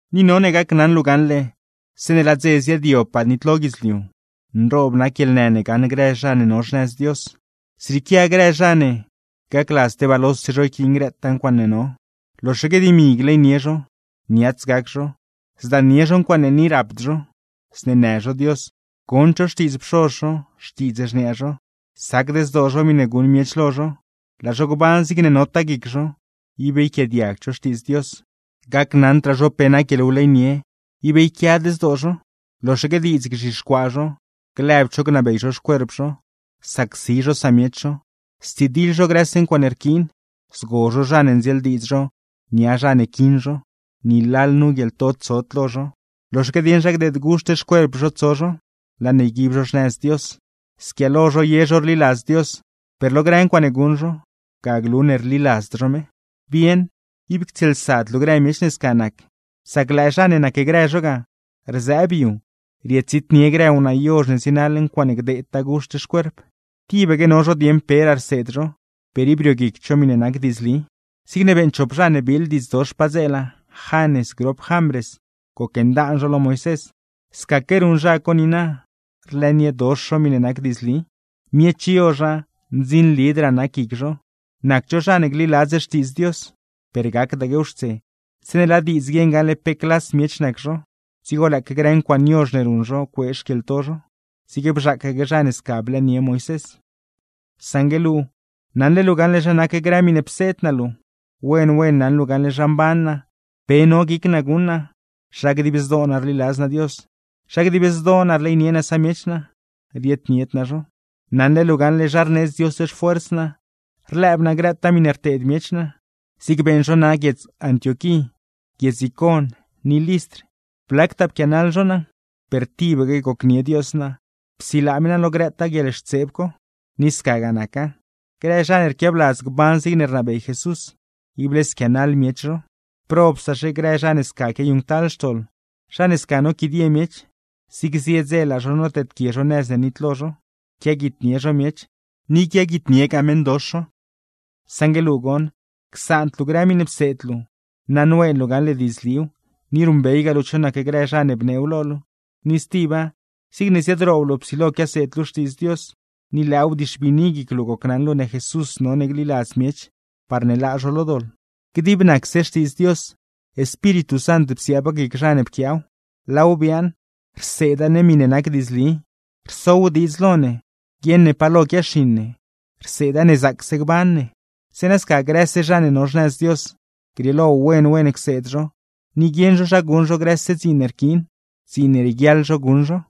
Ni none gacnaṉ luu gaṉle, zeeṉe laa dze ziaadyobpaa nitlo guidzliu, nroob nac guieḻnë ne gaṉ grë zha ne no xnëz Dios. Zrieequia grë zha ne: gacladz tebaa lose zho yquiin grëtaa ncuaaṉe no, loxaque dimi gleynie zho, niats gac zho, zdaannie zho ncuaaṉe ni rapd zho, zneenë zho Dios, gond zho xtiidz pxoz zho, xtiidz xniaa zho; sacd zdoo zho miṉe guṉ miech lo zho, laa zho gban zigne notaa guic zho, ib yquiaadiagd zho Xtiidz Dios. Gacnaṉdraa zho pe nac guieḻwleynie, ib yquiad zdoo zho, loxaque diidz gzhixcuaa zho, lëbd zho gnabey zho xcuerp zho, sacsi zho samiech zho, stsidiḻ zho grëse ncuaaṉe rquiin, zgo zho zha ne ndzieeldiidz zho nia zha ne quiṉ zho, ni lalnu guieḻto tsod lo zho, loxaque dieṉ zha gdeed guxt xcuerp zho tso zho, laa ne yguib zho xnëz Dios. Squiaalo zho ye zho rliladz Dios, per lo grë ncuaaṉe guṉ zho, ga glu ne rliladzd zho me. Bieṉ, ib ctsieelsad luu grë miech ne sca nac. Sac lëë zha ne nacgrë zho ga, rzëëb yu rietsitnie grë wnaa yozh ne zienaḻ ncuaaṉe gdeedtaa guxt xcuerp. Tibaque no zho dieeṉ peraa rseed zho, per ib rioguicd zho miṉe nac diidzli. Zigne beeṉ chop zha ne biiḻ diidz dox padzeela, Janes grop Jambres, gocndaan zho lo Moisés; scaque ruṉ zha co niina, rlëëniedox zho miṉe nac diidzli. Miech yozha, ndzinlidraa nac guic zho, nacd zho zha ne gliladz Xtiidz Dios; per gacdaquew xtse, zeeṉe laa diidz guieṉ gaṉle pe clas miech nac zho, dzigo lëëque grë ncuaaṉe yozh ne ruṉ zho cuee xquieḻto zho; zigne bzhaacaque zha ne sca blëënie Moisés. Saṉgue luu, naṉle luu gaṉle zha nac grë miṉe pseed naa luu. Wen wen naṉ luu gaṉle zha mban naa, pe no guic naa guṉ naa, zha dib zdoo naa rliladz naa Dios, zha dib zdoo naa rleynie naa samiech naa, rieednied naa zho. Naṉle luu gaṉle zha rneedz Dios xfuers naa, rlëëb naa grëtaa miṉe rteed miech naa, zig beeṉ zho naa guiedz Antioquí, guiedz Icon ni Listr, blactaa pquianaḻ zho naa; per tibaque gocnie Dios naa, psilaa me naa lo grëtaa guieḻxtseeb co. Ni scagaa naca, grë zha ne rquiabladz gban zigne rnabey Jesús, ible squianaḻ miech zho. Per probsaxe grë zha ne sca quiayuṉctal xtoḻ, zha ne sca noquidie miech, zig zie dze laa zho noteedquie zho nëz ne nitlo zho. Quiaguitnie zho miech, ni quiaguitniegaa meṉdox zho. Saṉgue luu goṉ, csaand luu grë miṉe pseed luu. Naṉween luu gaṉle diidzliw, ni ruṉbeygaa luu cho nac grë zha ne bneew lo luu. Ni stiba, zigne ziadroob luu psilo quiaseed luu Xtiidz Dios, ni lëëw bdixbiini guic luu gocnaṉ luu ne Jesús none gliladz miech parne laa zho lo doḻ. Dib nacse Xtiidz Dios, Espíritu Sant psiaaba guic zha ne pquiaaw, laaw biaaṉ: rseeda ne miṉe nac diidzli, rsow diidz lo ne guieṉ ne pa lo quiaxiṉ ne, rseeda ne zaacse gban ne. Zeeṉa sca grëse zha ne no xnëz Dios, grieelo wen wen cseed zho, ni guieṉ zho zha guṉ zho grëse dziin ne rquiin, dziin ne rieguiaḻ zho guṉ zho.